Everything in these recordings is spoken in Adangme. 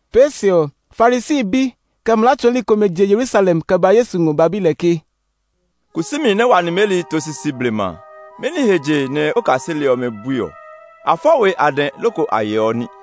Pee se ɔ, Farisi bi, kɛ mlaa tsɔɔli komɛ je Yerusalem kɛ ba Yesu ngɔ ba bi lɛ ke, “Kusumi nɛ wa nimeli to sisi blema a, mɛni he je nɛ o kaseli ɔmɛ bui ɔ? A fɔ we a dɛ loko a yeɔ ní!”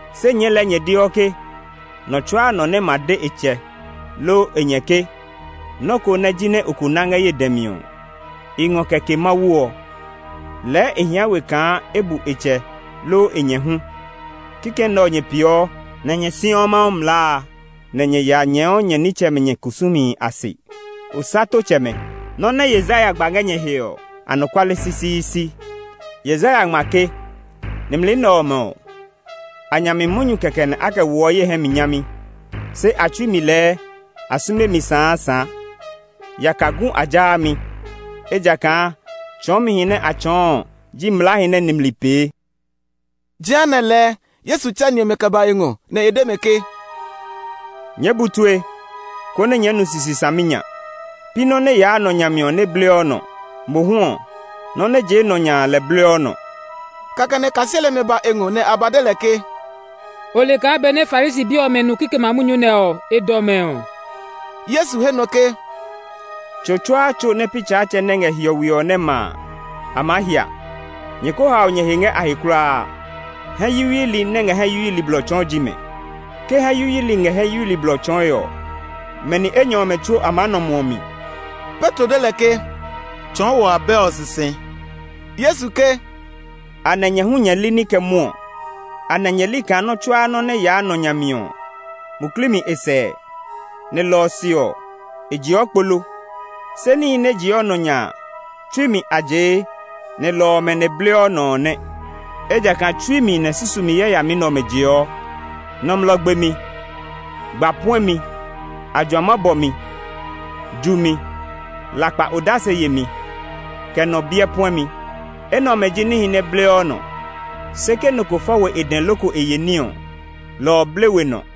Se nyɛɛ lɛɛ nyɛ deɔ ke, nɔ tsuaa nɔ nɛ ma de e tsɛ, loo e nyɛ ke, ‘Nɔ́ ko nɛ jinɛ o ko ná ngɛ ye dɛ mi ɔ, i ngɔ kɛ ke Mawu’ ɔ, lɛɛ e hia we kaa e bu e tsɛ loo e nyɛ hu. Kikɛ nɛ ɔ nyɛ peeɔ, nɛ nyɛ siɔ Mawu mlaa a, nɛ nyɛ ya nyɛɛɔ nyɛ nitsɛmɛ nyɛ kusumihi a se. Osatotsɛmɛ! Nɔ́ nɛ Yesaya gba ngɛ nyɛ he ɔ, anɔkuale sisiisi! Yesaya ngma ke, ‘Nimli nɛ ɔmɛ ɔ, a nya mi munyu kɛkɛ a kɛ woɔ ye hɛ mi nyami; se a tsui mi lɛɛ, a sume mi saasaa. Yaka gu a jaa mi, ejakaa tsɔɔmihi nɛ a tsɔɔ ji mlaahi nɛ nimli pee.’” Jehanɛ lɛɛ Yesu tsɛ ni ɔmɛ kɛ ba e ngɔ, nɛ e de mɛ ke, “Nyɛɛ bu tue, konɛ nyɛɛ nu sisi saminya! Pi nɔ́ nɛ yaa nɔ nya mi ɔ nɛ bleɔ nɔ; mohu ɔ, nɔ́ nɛ jee nɔ nya a lɛ bleɔ nɔ.” Kɛkɛ nɛ kaseli ɔmɛ ba e ngɔ nɛ a ba de lɛ ke, “O le kaa benɛ Farisi bi ɔmɛ nu kikɛmɛ a munyu nɛ ɔ, e dɔ mɛ ɔ?” Yesu he nɔ ke, “Tso tsuaa tso nɛ pi Tsaatsɛ nɛ ngɛ hiɔwe ɔ nɛ ma a, a maa hia. Nyɛ ko hao nyɛ he ngɛ a he kulaa! Hɛ yuyuili nɛ ngɛ hɛ yuyuili blɔ tsɔɔe ji mɛ. Ke hɛ yuyuilɔ ngɛ hɛ yuyuilɔ blɔ tsɔɔe ɔ, mɛ ni enyɔ ɔmɛ tsuo a maa nɔ muɔ mi.” Petro de lɛ ke, “Tsɔɔ wɔ abɛ ɔ sisi!” Yesu ke, “Anɛ nyɛ hu nyɛ li ní kɛ mwɔɔ? Anɛ nyɛ li kaa nɔ́ tsuaa nɔ́ nɛ yaa nɔ nya mi ɔ, muklii mi e sɛɛ, nɛ lɔ ɔ se ɔ, e jeɔ kpo lo? Se níhi nɛ jee nɔ nya a, tsui mi a jee; nɛ lɔ ɔmɛ nɛ bleɔ nɔ ɔ nɛ. Ejakaa tsui mi nɛ susumi yayami nɛ ɔmɛ jeɔ: nɔmlɔ gbemi, gba puɛmi, ajuama bɔmi, jumi, lakpa odase yemi, kɛ nɔ biɛ puɛmi. Enɛ ɔmɛ ji níhi nɛ bleɔ nɔ; se ke nɔ ko fɔ we e dɛ loko e ye ní ɔ, lɔ ɔ ble we nɔ.”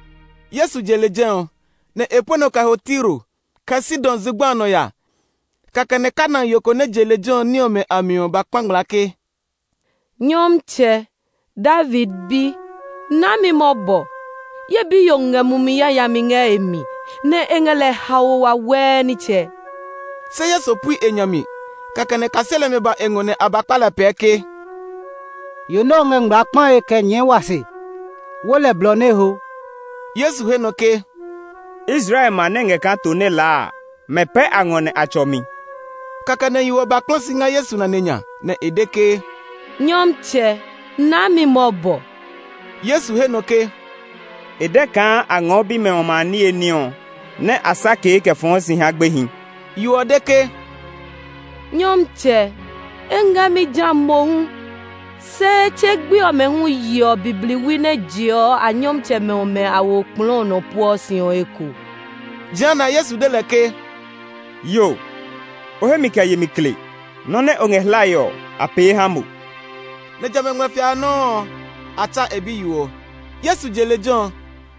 Yesu je lejɛ ɔ, nɛ e pue nɔ kɛ ho Tiro, kɛ Sidon zugba a nɔ ya. Kɛkɛ nɛ Kanaan yo ko nɛ je lejɛ ɔ ní ɔmɛ a mi ɔ ba kpa ngmlaa ke, “Nyɔmtsɛ, David Bi, naa mi mɔbɔ! Ye biyo ngɛ mumi yayami ngɛ e mi, nɛ e ngɛ lɛ haoe wawɛɛ nitsɛ.” Se Yesu pui e nya mi. Kɛkɛ nɛ kaseli ɔmɛ ba e ngɔ nɛ a ba kpa lɛ pɛɛ ke, “Yo nɛ ɔ ngɛ ngmlaa kpae kɛ nyɛɛ wa se! Wo lɛ blɔ nɛ e ho!” Yesu he nɔ ke, “Israel ma nɛ ngɛ kaa to nɛ laa a, mɛ pɛ a ngɔ nɛ a tsɔ mi.” Kɛkɛ nɛ yo ɔ ba kpla si ngɛ Yesu nane nya, nɛ e de ke, “Nyɔmtsɛ, naa mi mɔbɔ!” Yesu he nɔ ke, “E dɛ kaa a ngɔɔ bimɛ ɔmɛ a niye ní ɔ nɛ a sakee kɛ fɔɔ si ha gbehi.” Yo ɔ de ke, “Nyɔmtsɛ, e ngɛ mi ja mohu, se tse gbe ɔmɛ hu yeɔ bibliwi nɛ jeɔ a nyɔmtsɛmɛ ɔmɛ a we okplɔɔ nɔ pueɔ si ɔ eko!” Jehanɛ Yesu de lɛ ke, “Yo, o hemi kɛ yemi kle! Nɔ́ nɛ o ngɛ hlae ɔ, a pee ha mo!” Nɛ jamɛ a ngmlɛfia a nɔuu ɔ, a tsa e biyo ɔ. Yesu je lejɛ ɔ,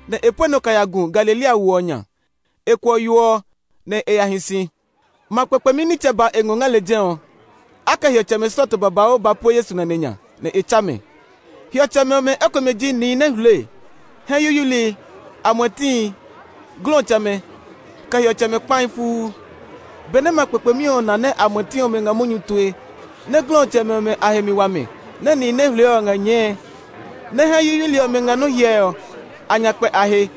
nɛ e pue nɔ kɛ ya gu Galilea wo ɔ nya. E kuɔ yo ɔ nɛ e ya hi si. Ma kpekpemi nitsɛ ba e ngɔ ngɛ lejɛ ɔ. A kɛ hiɔtsɛmɛ slɔɔto babauu ba pue Yesu nane nya, nɛ e tsa mɛ. Hiɔtsɛmɛ ɔmɛ ekomɛ ji nihi nɛ hule, hɛ yuyuili, amuɛtihi, glɔtsɛmɛ, kɛ hiɔtsɛmɛ kpahi fuu. Benɛ ma kpekpemi ɔ na nɛ amuɛti ɔmɛ ngɛ munyu tue, nɛ glɔtsɛmɛ ɔmɛ a he mi wa mɛ, nɛ nihi nɛ hule ɔ ngɛ nyɛɛe, nɛ hɛ yuyuili ɔmɛ ngɛ nɔ́ hyɛe ɔ, a nya kpɛ a he.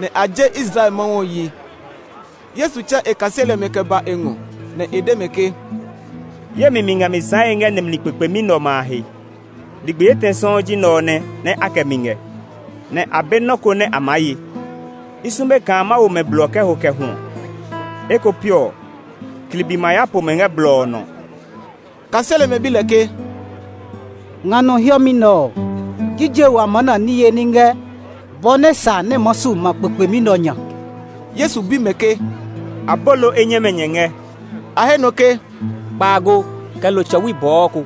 Nɛ a je Israel Mawu ɔ yi. Yesu tsɛ e kaseli ɔmɛ kɛ ba e ngɔ, nɛ e de mɛ ke, “Ye mi mi ngɛ mi sããe ngɛ nimli kpekpemi nɛ ɔmɛ a he. Ligbi etɛ sɔuu ji nɛ ɔ nɛ a kɛ mi ngɛ, nɛ a be nɔ́ ko nɛ a maa ye. I sume kaa ma wo mɛ blɔ kɛ ho kɛ hwɔ; eko piɔ klibi ma ya po mɛ ngɛ blɔ ɔ nɔ.” Kaseli ɔmɛ bi lɛ ke, “Nga nɔ hiɛmɛ nɛ ɔ, jije wa ma na niye ní ngɛ bɔ nɛ sa nɛ maa su ma kpekpemi nɛ ɔ nya?” Yesu bi mɛ ke, “Abolo enyɛmɛ nyɛ ngɛ?” A he nɔ ke, “Kpaago, kɛ lo tsɔwi bɔɔ ko.”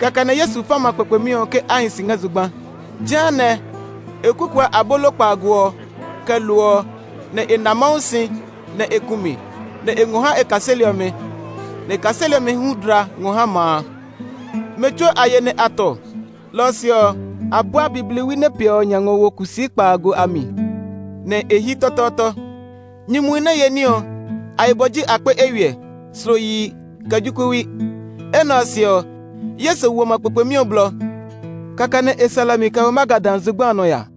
Kɛkɛ nɛ Yesu fa ma kpekpemi ɔ ke a hi si ngɛ zugba. Jehanɛ, e kukuɔ abolo kpaago ɔ, kɛ lo ɔ, nɛ e na Mawu si, nɛ e ku mi, nɛ e ngɔ ha e kaseli ɔmɛ. Nɛ e kaseli ɔmɛ hu dla ngɔ ha ma a. Mɛ tsuo a ye nɛ a tɔ. Lɔ ɔ se ɔ, a bua bibliwi nɛ piɛ ɔ nya ngɔ wo kusii kpaago a mi, nɛ a hyi tɔtɔɔtɔ. Nyumuhi nɛ ye ní ɔ, a yibɔ ji akpe eywiɛ, slo yihi, kɛ jokuɛwi. Enɛ ɔ se ɔ, Yesu wo ma kpekpemi ɔ blɔ. Kɛkɛ nɛ e sɛ lɛ mi kɛ ho Magadan zugba a nɔ ya.